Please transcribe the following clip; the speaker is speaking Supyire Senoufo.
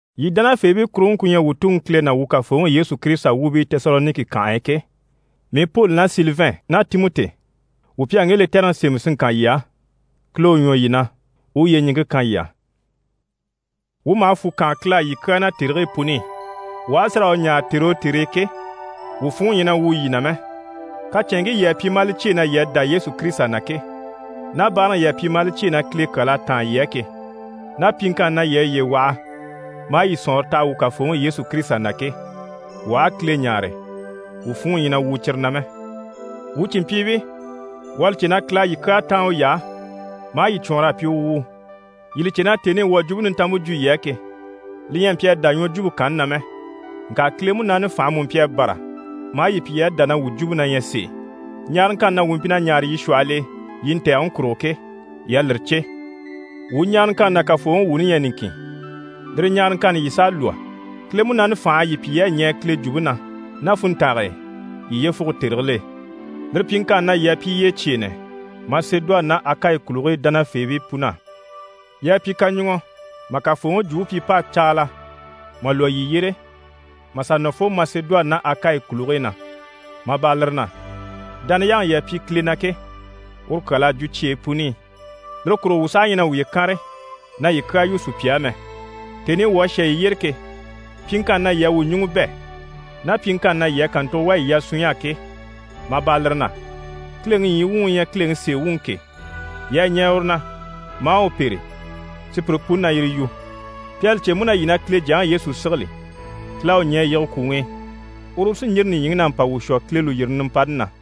Yii dánafeebii kuruŋke ku ɲyɛ wuu Tuŋi Kile ná wuu Kafooŋi Yesu Kirisita wuubii Tesaloniki kànhe e ke, mii Poli ná Silivɛn ná Timɔti, wuu pi à ŋge lɛtɛrɛŋi sémɛ si ŋkan yii á. Kile u ɲwɔ yii na, u u yyeɲiŋke kan yii á. Wuu maha fwù kaan Kile á yii kyaa na tèrigii puni i. Wuu aha a si raa u ɲáare tère o tère e ke, wuu funŋɔ ɲyɛ na wwùu yii na mɛ. Kacɛnŋkii yii à pyi maa li cyêe na yii à dá Yesu Kirisita na ke, ná báaraŋi yii à pyi maa li cyêe na Kile kyal'à táan yii á ke, ná pyiŋkanni na yii à yiye waha maa yii sɔ̀nŋɔre taha wuu Kafooŋi Yesu Kirisita na ke, wuu aha a Kile ɲáare, wuu funŋɔ ɲyɛ na wwùu cyire na mɛ. Wuu cìnmpyiibii, wuu à li cè na Kile à yii kyaa táan uy'á maa yii cwɔɔnr'a pyi u wuu. Yii li cè na tèni i wuu à Jwumpe Nintanmpe jwo yii á ke, li ɲyɛ a mpyi a dá ɲwɔjwumpe kanni na mɛ, ŋka Kile Munaani fànhe mú mpyi a bâra maa yii pyi yii à dá na wuu jwumpe na ɲyɛ sèe. Ɲaaraŋkanni na wuu mpyi na ɲaare yii shwɔhɔl'e yii ntɛ̀gɛŋi kurugo ke, yii à lire cè. Wuu ɲaaraŋkanni ná Kafooŋi wuuni ɲyɛ niŋkin, lire ɲaaraŋkanni yii s'à lwɔ́. Kile Munaani fành'à yii pyi yii à ɲɛɛ Kile jwumpe na ná funntange e yii yyefuge tèrigil'e. Lire pyiŋkanni na, yii à pyi yyecyeenɛ Masedoni ná Akayi kùligii dánafeebii pun'á. Yii à pyi kaɲuŋɔ mà Kafooŋi Jwumpe pyi p'à caala mà lwɔ́ yii yyére, mà sà nɔ fo Masedoni ná Akayi kùligii na, mà bâra lire na, dániyaŋi yii à pyi Kile na ke, uru kyal'à jwo cyeyi puni i. Lire kurugo wuu saha ɲyɛ na wuye kànre na yii kyaa yu sùpya á mɛ. Tèni i wuu à shà yii yyére ke, pyiŋkanni na yii à wuu ɲùŋɔ bɛ̂, ná pyiŋkanni na yii à kàntugo wà yii yasunɲy'á ke, mà bâra lire na, Kileŋi ɲyii wuŋi u ɲyɛ Kileŋi sèe wuŋi ke, yii à ɲɛɛ uru na maa u pêre, sùpyire puni na yire yu. Pi à li cè mú na yii na Kile Jyaŋi Yesu sigili. Kile à u ɲɛ̀ a yige kwùŋi i, uru u sí n‑yîri nìɲyiŋi na mpa wuu shwɔ Kile lùyirini nimpani na.